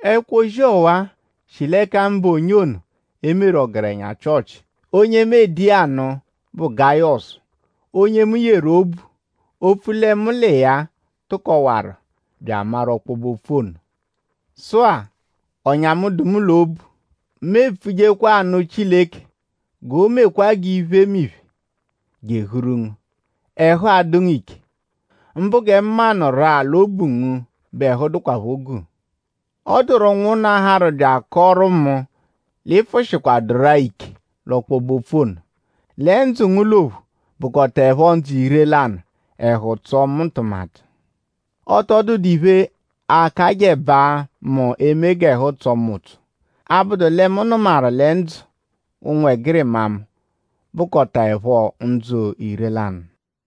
Ẹkwo-ozi ọwa-a shi l'ẹka mụbe onye e meru ọgerenya Chịochi. Onye mu ede iya anụ bụ Gayọsu onye mu yeru obu opfu lẹ mu l'iya tụkowaru bya amaru ọkpobe-opfu ono. Sụ-a; ọ̀nyà mu, dụ mu l'obu; mu epfujekwa anụ Chileke g'o mekwaa g'iphemiphe, jehuru ngu; ẹhu adụ ngu ike; mbụ gẹ mu maanuru-a l'obu ngu bẹ ẹhu dụkwapho guu. Ọ dụru ụnwunna, harụ bya akọoru mu l'ị pfụ-shikwaduru-a ike l'ọkpobe-opfu ono; lẹ ndzụ ngu l'ophu bụkotaepho ndzụ ire-lanụ. Ẹhu tsọo mu ntụmatu. Ọ tọ dụdu iphe, akajẹbaa mu eme g'ẹhu tsọo mu ụtso; 'abụdu lẹ mu nụmaru lẹ ndzụ ụnwegirima mu bụkotaepho ndzụ ire-lanụ.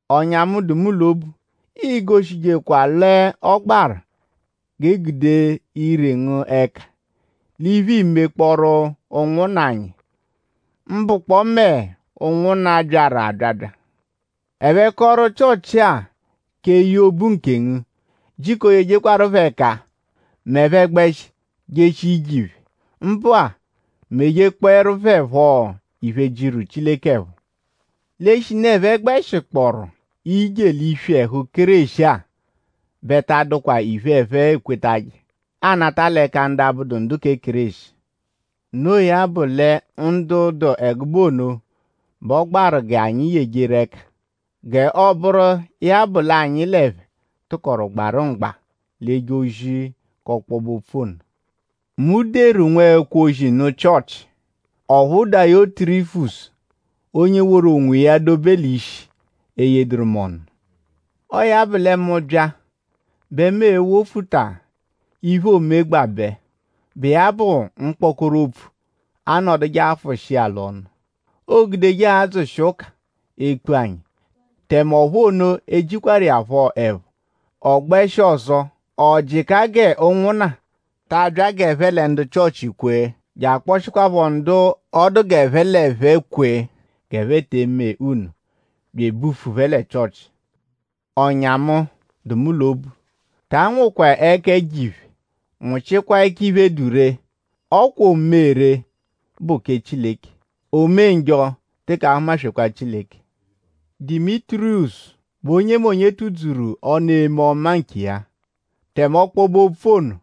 Ọ̀nyà mu, dụ mu l'obu; iigoshijekwa l'ọ gbaru g'e gude ire ngu ẹka l'iphe, iimekpọoru ụnwunna anyi; mbụkpoo mẹ ụnwunna, byaru abyabya. Ẹphe kọru Chịochi-a k'eye obu nkengu. Jiko yejekwaru phẹ ẹka m'ẹphe -gbẹshi jeshia ije phẹ. Mbụ-a; mejekpọeru phẹ phọ iphe, jiru Chileke ẹpho. L'eshinu ẹphe gbẹshikpooru ije l'iswi ẹhu Kéreshi-a bẹ ta adụkwa iphe, ẹphe ekweje anata l'ẹka ndu abụdu ndu kẹ Kéreshi. Noo ya bụ lẹ ndu dụ ẹgube ono bẹ ọ gbaru kẹ g'anyi yejeru ẹka; g'ọo-bụru iya bụ l'anyi l'ẹphe tụkoru gbarụ mgba l'eje ozi k'ọkpobe-opfu ono. Mu deru nwẹkwo-ozi nụ Chịochi; ọphu Dayotirifisu, onye woru onwiya dobe l'ishi eyeduru mu ọnu. Ọo ya bụ lẹ: mu -bya; bẹ mu e-wofuta iphe, oomegbabẹ, bụ iya bụ mkpọkoro opfu, anọduje afụshi iya l'ọnu, oogudeje adzụshi ụka ekpu anyi. Tẹme ọphu ono ejikwaru iya phọ ẹpho. Ọ gbẹshi ọzo; ọ jịka g'ụnwunna ta abya g'ẹphe lẹ ndu Chịochi kwee; bya akpọshikwaapho ndu ọ dụ g'ẹphe l'ẹphe kwee g'ẹphe te eme nno; bya ebufu phẹ lẹ Chịochi. Ọ̀nyà mu, dụ mu l'obu; ta anwụkwa ẹka ẹjo-iphe; nwụchikwa ẹka iphe, dụ ree. Ọ kwa o-me-ree bụ kẹ Chileke; o-me-njọ teke ahụma-swekwaa Chileke. Dimitiriyọsu bẹ onyemonye tụ-dzuru ọnu eme ọma nkiya; tẹme ọkpobe-opfu ono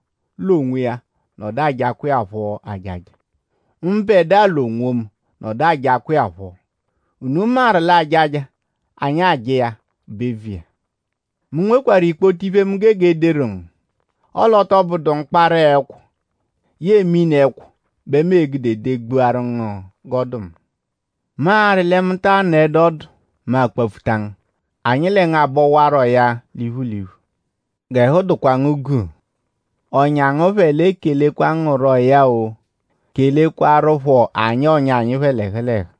l'onwiya nọdu ajakwa iya phọ ajaja; mbẹdua l'onwomu nọdu ajakwa iya phọ. Unu maru l'ajaja, anyi aja iya bụ eviya. Mu nwekwarụ ikpoto iphe, mu gege ederu ngu; ọle ọ tọ bụdu mkpara-ẹkwo yẹe mini-ẹkwo bẹ mu e-gude degbuaru ngu g'ọ dụ mu. Mu arị lẹ mu ta anọedu ọdu; mu akpapfuta ngu; anyi lẹ ngu abọwaroya l'iphu l'iphu. G'ẹhu dụkwa ngu guu. Ọ̀nyà ngu phẹ l'ekelekwa ngu rọya-o. Kelekwaruphọ anyi ọ̀nyà anyi phẹ l'ẹhu l'ẹhu.